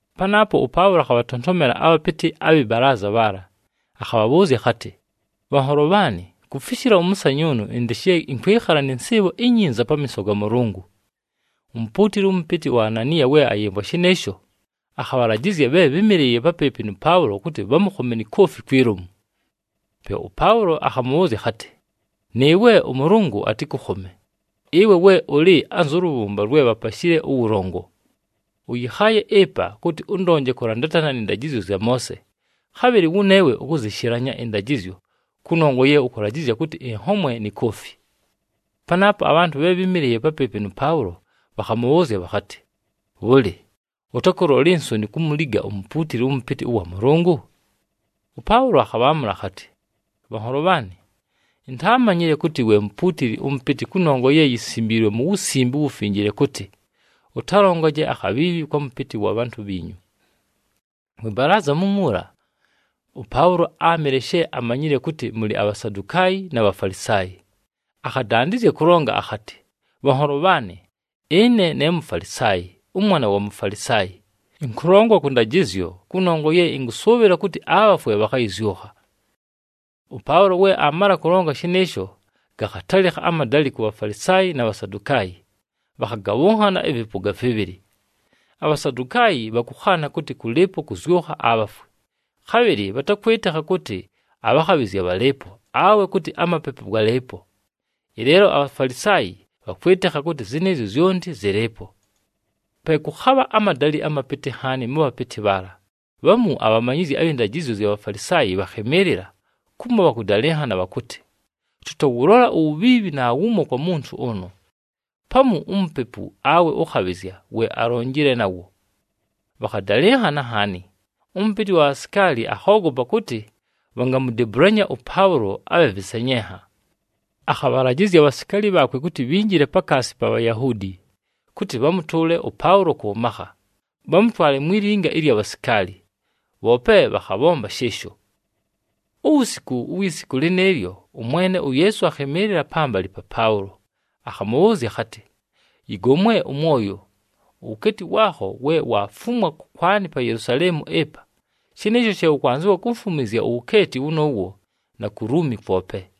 Panaapo ʉPaʉlo akhabhatontomela abhapɨtɨ abhɨ balaaza bhaala, akhabhabhʉʉzya akhatɨ, “Bhanholo bhaanɨ, kufishila ʉmʉsanyʉʉnʉ ɨndɨ she ɨnkwɨkhala nɨ nsɨɨbho inyinza pamiiso ga Mʉlʉngʉ.” Umupuutili ʉmʉpɨtɨ uAnaniya we ayɨmvwa shɨnɨɨsho, akhabhalajɨzya bhe bhɨ́mɨlɨɨye papɨɨpɨ nʉ Paʉlo kʉtɨ bhamʉkhome ni koofi kwi lomu. Pe ʉPaʉlo akhamʉbhʉʉzya akhatɨ, “Nɨɨwe ʉMʉlʉngʉ atɨkʉkhome, ɨwe we ʉlɨ anzʉ lʉbhʉmba lwe bhapashile ʉwʉlongo! Ʉyɨkhaaye ɨpa kʉtɨ ʉndonje kʉlandatana nɨ ndajɨzyo zya Moose, khabhɨlɨ wʉneewe ukuzishilanya ɨndajɨzyo kʉnongwa ye ʉkʉlajɨzya kʉtɨ ɨnhomwe ni koofi!” Panaapo abhantʉ bhe bhɨ́mɨlɨɨye papɨɨpɨ nʉ Paʉlo bhakhamʉbhʉʉzya bhakhatɨ, “Bhʉlɨ, ʉtakʉlola insoni kumuliga umupuutili ʉmʉpɨtɨ ʉwa Mʉlʉngʉ?” ɄPaʉlo akhabhaamʉla akhatɨ, “Bhanholo bhaanɨ, intaamanyile kʉtɨ we mupuutili ʉmʉpɨtɨ kʉnongwa ye yisimbiilwe mu Wusimbe uWufinjile kʉtɨ, ‘Ʉtalongaje akhabhiibhi kwa mʉpɨtɨ wa bhantʉ bhiinyu.’” Mwɨ balaaza mumuula, ʉPaʉlo áamɨle she amanyile kʉtɨ mʉlɨ aBhasadukaayi, na Bhafalisaayi, akhadandɨzya kʉlonga akhatɨ, “Bhanholo bhaanɨ, ɨne ne Mufalisaayi, ʉmwana wa Mufalisaayi. Ɨnkʉlongwa kʉ ndajɨzyo, kʉnongwa ye ɨnkʉsʉʉbhɨla kʉtɨ abhafwe bhakhayɨzyʉkha.” ɄPaʉlo we aamala kʉlonga shɨnɨɨsho gakhatalɨkha amadalɨ ku Bhafalisaayi na Bhasadukaayi, bhakhagabhʉnhana ɨvɨpʉga vɨbhɨlɨ. ABhasadukaayi bhakʉkhaana kʉtɨ kʉlɨɨpo kʉzyʉkha abhafwe, khabhɨlɨ bhatakwɨtɨkha kʉtɨ abhakhabhɨzya bhalɨɨpo, awe kʉtɨ amapepu galɨɨpo. Ɨleelo aBhafalisaayi bhakwɨtɨkha kʉtɨ zɨnɨɨzyo zyonti zɨlɨɨpo. Pe kʉkhabha amadalɨ amapɨtɨ nhaani mʉ bhapɨtɨ bhaala. Bhamu abhamanyizyi abhɨ ndajɨzyo zya Bhafalisaayi bhakhɨmɨɨlɨla kumo bhakʉdalɨnhana bhakʉtɨ, “Tʉtawʉlola uwubhiibhi naawumo kwa muntu ʉnʉ. Pamu umupepu, awe ʉkhabhɨzya, we alonjile nawo.” Bhakhadalɨnhana nhaani, ʉmʉpɨtɨ wa bhasikaali akhoogopa kʉtɨ bhangamudebulanya ʉPaʉlo abhe vɨsenyenha. Akhabhalajɨzya abhasikaali bhaakwe kʉtɨ bhinjile pakaasi pa Bhayahuudi, kʉtɨ bhamʉtʉʉle ʉPaʉlo kʉ makha, bhamʉtwale mwi linga ɨlya bhasikaali, bhoope bhakhabhomba shɨɨsho. Uwusiku uwi siku lɨnɨɨlyo, ʉMwene uYeesu akhɨmɨɨlɨla pambalɨ pa Paʉlo, akhamʉbhʉʉzya akhatɨ, “Yɨgomwe ʉmwoyo! Uwukeeti waakho we waafumwa kʉkwanɨ pa Yelusaleemu ɨpa, shɨnɨɨsho she ʉkwanzɨwa kumfumwizya uwukeeti wʉnʉʉwo na ku Luumi kwope.”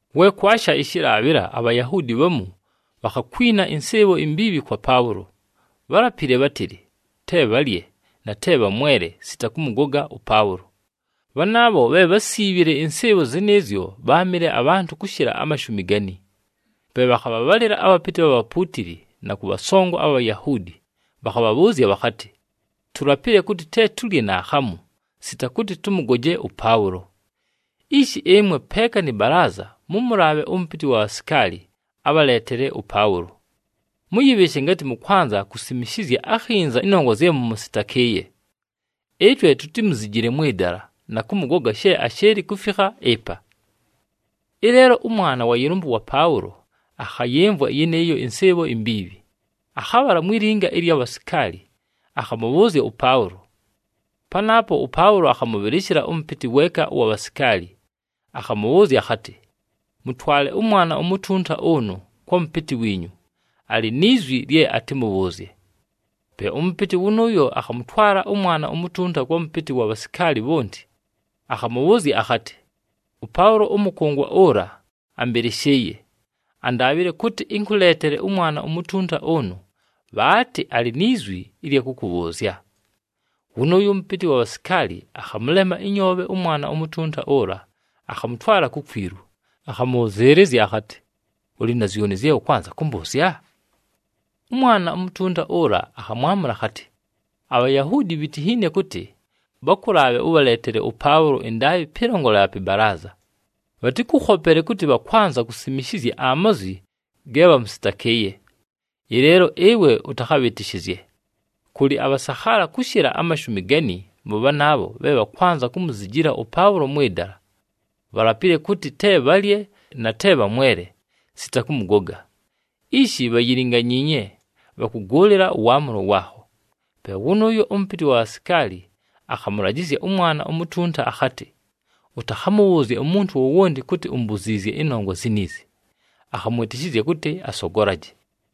We kwasha ɨshɨlaabhɨla, aBhayahuudi bhamu bhakhakwina ɨnsɨɨbho imbiibhi kwa Paʉlo. Bhálapile bhátɨlɨ te bhalye, na te bhamwele, sita kʉmʉgoga ʉPaʉlo. Bhanaabho bhe bhásiibhile ɨnsɨɨbho zɨnɨɨzyo bháamɨle abhantʉ kʉshɨla amashumi gani. Pe bhakhabhabhalɨla abhapɨtɨ abha bhapuutili na kʉ bhasongo abha Bhayahuudi, bhakhabhabhʉʉzya bhakhatɨ, “Tulapile kʉtɨ te tulye naakhamu, sita kʉtɨ tʉmʉgoje ʉPaʉlo. Ishi ɨmwe peeka nɨ balaaza mʉmʉlaabhe ʉmʉpɨtɨ wa bhasikaali abhaleetele ʉPaʉlo. Mʉyɨbhɨɨshe ngatɨ mʉkwanza kusimishizya akhinza ɨnongwa zye mʉmʉsɨtakɨɨye. Ɨtwe tutimuzijile mwɨ dala, na kʉmʉgoga she ashɨɨlɨ kufikha ɨpa.” Ɨleelo ʉmwana wa yɨlʉmbʉ wa Paʉlo akhayɨmvwa yɨnɨɨyo ɨnsɨɨbho imbiibhi. Akhabhala mwi linga ɨlya bhasikaali, akhamʉbhʉʉzya ʉPaʉlo. Panaapo ʉPaʉlo akhamʉbhɨlɨshɨla ʉmʉpɨtɨ weeka ʉwa bhasikaali, akhamʉbhʉʉzya akhatɨ, “Mʉtwale ʉmwana umutunta ʉnʉ kwa mʉpɨtɨ wiinyu, alɨ ni zwi lye atɨmʉbhʉʉzye.” Pe ʉmʉpɨtɨ wʉnʉʉyo akhamʉtwala ʉmwana umutunta kwa mʉpɨtɨ wa bhasikaali bhonti, akhamʉbhʉʉzya akhatɨ, “ɄPaʉlo ʉmʉkʉngwa ʉla ambɨlɨshɨɨye. Andaabhile kʉtɨ ɨnkʉleetele ʉmwana umutunta ʉnʉ, bhaatɨ alɨ ni zwi ɨlya kʉkʉbhʉʉzya.” Wʉnʉʉyo ʉmʉpɨtɨ wa bhasikaali akhamʉlema ɨnyoobhe ʉmwana umutunta ʉla, akhamʉtwala kukwilu, akhamʉbhʉzɨɨlɨzya akhatɨ, “Ʉlɨ na zyoni zye ʉkwanza kʉmbʉʉzya?” Ʉmwana umutunta ʉla akhamwamʉla akhatɨ, “ABhayahuudi bhitinhiine kʉtɨ bhakʉlaabhe ʉbhaleetele ʉPaʉlo ɨndaabhɨ pɨlongolela pɨ balaaza. Bhatɨkʉkhopele kʉtɨ bhakwanza kusimishizya amazwi ge bhamʉsɨtakɨɨye. Ɨleelo ɨwe ʉtakhabhɨtɨshɨzye, kʉlɨ abhasakhaala kʉshɨla amashumi gani mʉ bhanaabho bhe bhakwanza kumuzijila ʉPaʉlo mwɨ dala. Bhalapile kʉtɨ te bhalye, na te bhamwele, sita kʉmʉgoga. Ishi, bhayilinganyiinye, bhakʉgʉʉlɨla ʉwaamʉlo waakho.” Pe wʉnʉʉyo ʉmʉpɨtɨ ʉwa bhasikaali akhamʉlajɨzya ʉmwana umutunta akhatɨ, “Ʉtakhamʉbhʉʉzye umuntu wowonti kʉtɨ umbuziizye ɨnongwa ziniizi.” Akhamwɨtɨshɨzya kʉtɨ asogolaje.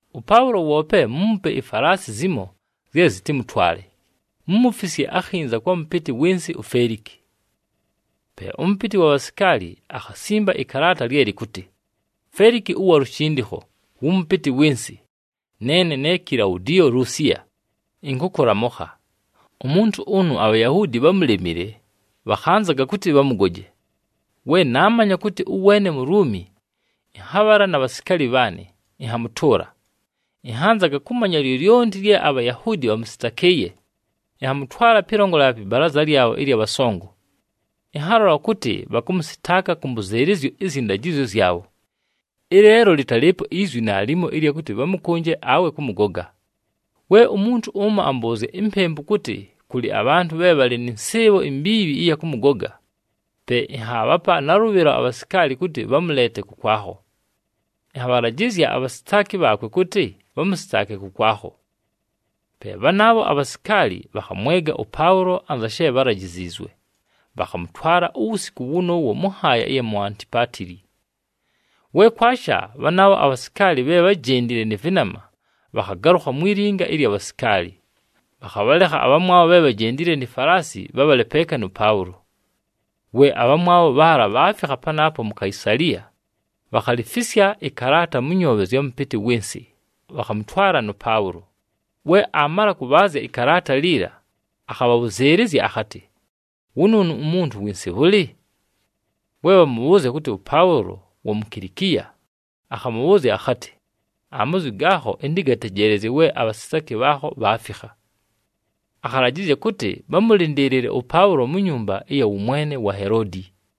ɄPaʉlo woope muumupe ifalaasi zimo zye zɨtɨmʉtwale, mumufisye akhinza kwa mʉpɨtɨ wɨ nsɨ uFeliki.” Pe ʉmʉpɨtɨ wa bhasikaali akhasimba ɨkalaata lye lɨkʉtɨ, “Feliki ʉwa lushindikho wʉ mʉpɨtɨ wɨ nsɨ, neene ne Kilaudiyo Lusiya, ɨnkʉkʉlamʉkha. Umuntu ʉnʉ aBhayahuudi bhámulemile, bhakhanzaga kʉtɨ bhamʉgoje. We naamanya kʉtɨ ʉweene Muluumi, ɨnhabhala na bhasikaali bhaanɨ, ɨnhamʉtʉʉla. Ɨnhanzaga kʉmanya lyolyonti lye aBhayahuudi bhamʉsɨtakɨɨye, ɨnhamʉtwala pɨlongolela pɨ balaaza lyabho ɨlya bhasongo. Ɨnhalola kʉtɨ bhakʉmʉsɨtaaka kʉ mbʉzɨɨlɨzyo ɨzyɨ ndajɨzyo zyabho. Ɨleelo lɨtalɨɨpo izwi naalimo ɨlya kʉtɨ bhamʉkʉnje awe kʉmʉgoga. We umuntu ʉmo ambʉʉzya impempu kʉtɨ kʉlɨ abhantʉ bhe bhalɨ nɨ nsɨɨbho imbiibhi ɨya kʉmʉgoga, pe ɨnhaabhapa nalʉbhɨlo abhasikaali kʉtɨ bhamʉleete kʉkwakho. Ɨnhabhalajɨzya abhasitaaki bhaakwe kʉtɨ bhamʉsɨtaake kʉkwakho.” Pe bhanaabho abhasikaali bhakhamwega ʉPaʉlo anza she bhalajiziizwe, bhakhamʉtwala uwusiku wʉnʉʉwo mʉ nhaaya ɨya mu Antipatili. We kwasha, bhanaabho abhasikaali bhe bhájendile nɨ vɨnama bhakhagalʉkha mwi linga ɨlya bhasikaali, bhakhabhalekha abhamwabho bhe bhajendile ni falaasi bhabhale peeka nʉ Paʉlo. We abhamwabho bhaala bhaafikha panaapo mu Kaisaliya, bhakhalifisya ɨkalaata mʉ nyoobhe zya mʉpɨtɨ wɨ nsɨ, bhakhamʉtwala nʉ Paʉlo. We aamala kʉbhaazya ɨkalaata liila, akhabhabhʉzɨɨlɨzya akhatɨ, “Wʉnʉʉnʉ umuntu wɨ nsɨ bhʉlɨ?” We bhamʉbhʉʉzya kʉtɨ ʉPaʉlo wa mu Kilikiya, akhamʉbhʉʉzya akhatɨ, “Amazwi gaakho, ɨntɨgatejeelezye we abhasitaaki bhaakho bhaafikha.” Akhalajɨzya kʉtɨ bhamʉlɨndɨɨlɨle ʉPaʉlo mu nyumba ɨya wʉmwene wa Heloodi.